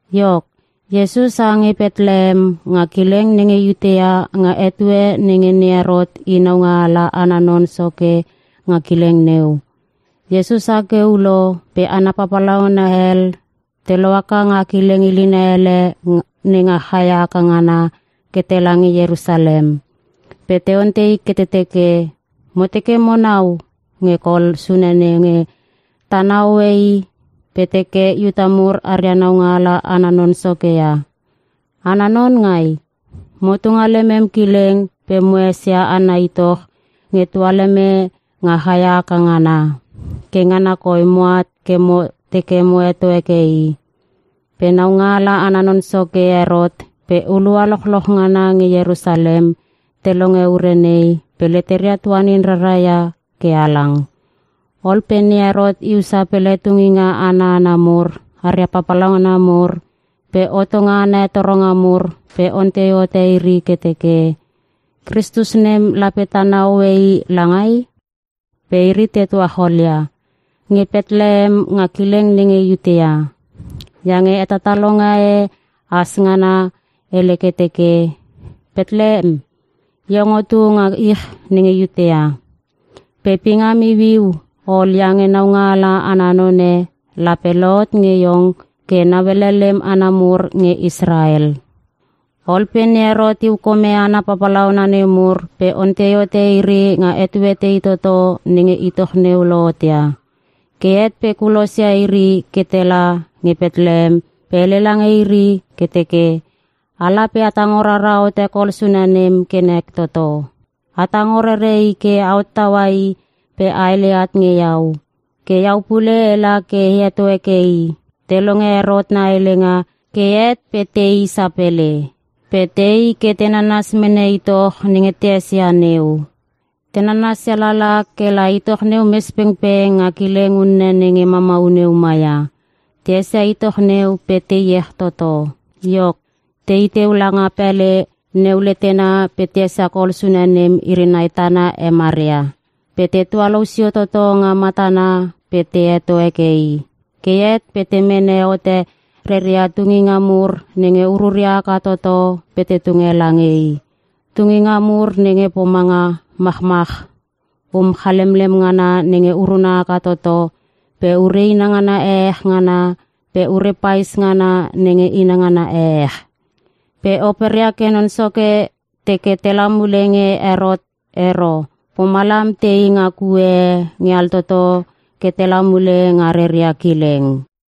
Iok, Iesus ha nge Petlehem nga kileng nenge Iutea nga etue nenge ne Herot i naungaala ana non soke nga kileng neu. Iesus ha ke ulo pe hana papalauna hel te lohaka nga kileng ilina hele nenga chaia haka ngana pe tela nge Ierusalem. Pe te ontei ke te teke, “Mo teke mo nau nge kol sune nenge tana hoe i pe te teke Iuta mur aria naungaala ana non soke ia. Ana non ngai? Motu nga lemem kileng pe mo esia ana itoch nge tualeme nga chaia haka ngana. Ke ngana koi moat ke mo teke mo heto heke i.” Pe naungaala ana non soke Herot pe hulua lochloch ngana nge Ierusalem te longe ure nei pe leteria tuanin rara ia ke halang. Ol pe ne Herot iu sapele tunginga ana hana mur aria papalauna mur pe hotonga ana hetoronga mur pe ontei hote iri ke teke, “Kristus nem lape tana hoe i langai?” Pe iri te tuacholia, “Nge Petlehem nga kileng nenge Iutea. Iange hetatalonga e has ngana hele ke teke, “‘Petlehem iong otu nga ich nenge Iutea. Pe pingam iuiu ol iange Naungaala ana Non e lape lohot nge iong ke nauele lek hana mur nge Israel.’” Ol pe ne Herot iu kome hana papalauna nemur pe ontei hote iri nga etue tei toto nenge itoch neu lohot ia. Ke het pe kulosia iri ke tela nge Petlehem pe hele lange iri ke teke, “Ala pe a tango rara hote kol sune nem ke nek toto. A tango rere i ke a hottaua i pe a hele at nge iau. Ke iau pule ela ke e heto heke i.” Te longe Herot na helenga ke het pe te i sapele. Pe te i ke te nanas mene itoch nenge te esia neu. Te nanasia lala ke la itoch neu mes pengpeng nga kileng unne nenge mamau neu maia. Te esia itoch neu pe te iech toto. Iok, te i teu langa pele neu letena pe te esia kol sune nem iri nai tana he Maria. Pe te tualou sio toto nga matana pe te heto heke i. Ke het pe te mene hote reria tunginga mur nenge ururia haka toto pe te tunge lange i. Tunginga mur nenge pomanga (machmach) um chalemlem ngana nenge uruna haka toto pe ure inangana ehech ngana pe ure pais ngana nenge inangana ehech. Pe operia ke Non Soke teke tela mule nge Herot ero pomalam te i nga kue e nge altoto ke tela mule nga reria kileng.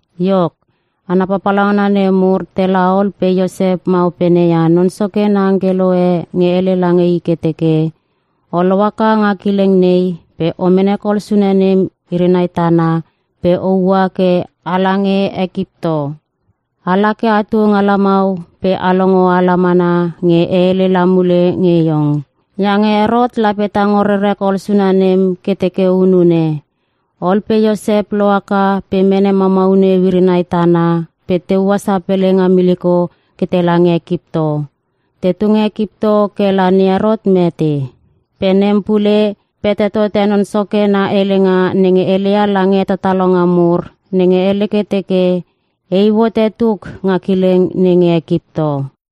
Iok, hana papalauna nemur tela ol pe Iosep ma opene ia Non Soke na angkelo e nge hele lange i ke teke, “O lohaka nga kileng nei pe o mene kol sune nem iri nai tana pe a ua ke a lange Ekipto. Ala ke atu nga lamau pe o longo ala mana nge e hele la mule nge iong. Iange Herot lape tango rere kol sune nem ke teke hunune.” Ol pe Iosep lohaka pe mene mamau neu iri nai tana pe te ua sapele nga miliko ke tela nge Ekipto. Tetu nge Ekipto ke la ne Herot mete. Pe nem pule pete tote Non Soke na helenga nenge heleia lange hetatalonga mur nenge hele ke teke, “E iu hote tuk nga kileng nenge Ekipto.”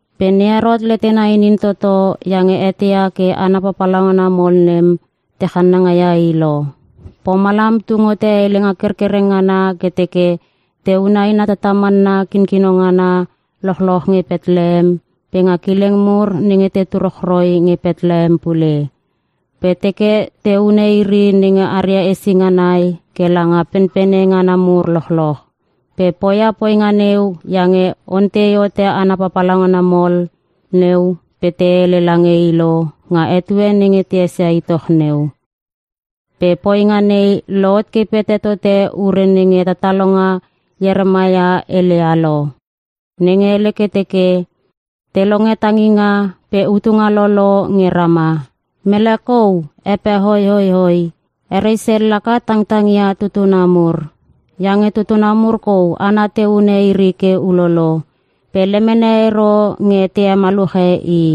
Pe ne Herot letena inin toto iange eteia ke hana papalauna mol nem te channangaia i lo. Pomalam tung hote helenga kerkereng ngana ke teke te hune aina tatamanna kinkino ngana lochloch nge Petlehem pe nga kileng mur nenge tetu rochroi nge Petlehem pule. Pe teke te hune iri nenge aria hesinga nai ke langa penpene ngana mur lochloch. Pe poia poinga neu iange ontei hote hana papalauna mol neu pe te hele lange i lo nga etue nenge te esia itoch neu. Pe poinga nei lohot ke pete tote ure nenge hetatalonga Ieremaia heleia lo. Nenge hele ke teke: “Te longe tanginga pe utunga lolo nge Rama. Mele kou hepehoihoihoi. He Resel laka tangtang ia tutuna mur. Iange tutuna mur kou hana te hune iri ke ulolo. Pe lemene ero nge te hemaluche i.”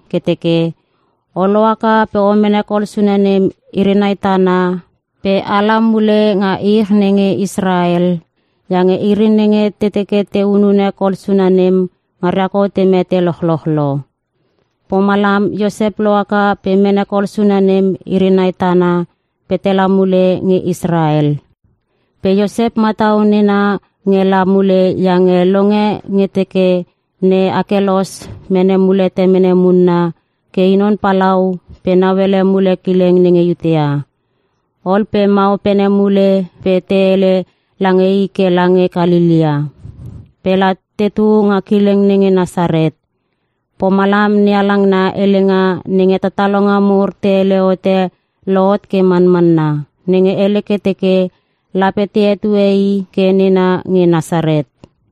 ke teke, “O lohaka pe o mene kol sune nem iri nai tana pe a la mule nga ich nenge Israel iange iri nenge te teke te hunune kol sune nem ngaria kou te mete lochloch lo.” Pomalam Iosep lohaka pe mene kol sune nem iri nai tana pe tela mule nge Israel. Pe Iosep matau nena nge la mule iange longe nge te teke ne Akelos mene mule temene munna ke i non palau pe nauele mule kileng nenge Iutea. Ol pe ma opene mule pe te hele lange i ke lange Kalelea pe la tetu nga kileng nenge Nasaret. Pomalam NeHalang na helenga nenge hetatalonga mur te hele hote lohot ke manmanna. Nenge hele ke teke, “Lape te hetue I ke nena nge Nasaret.”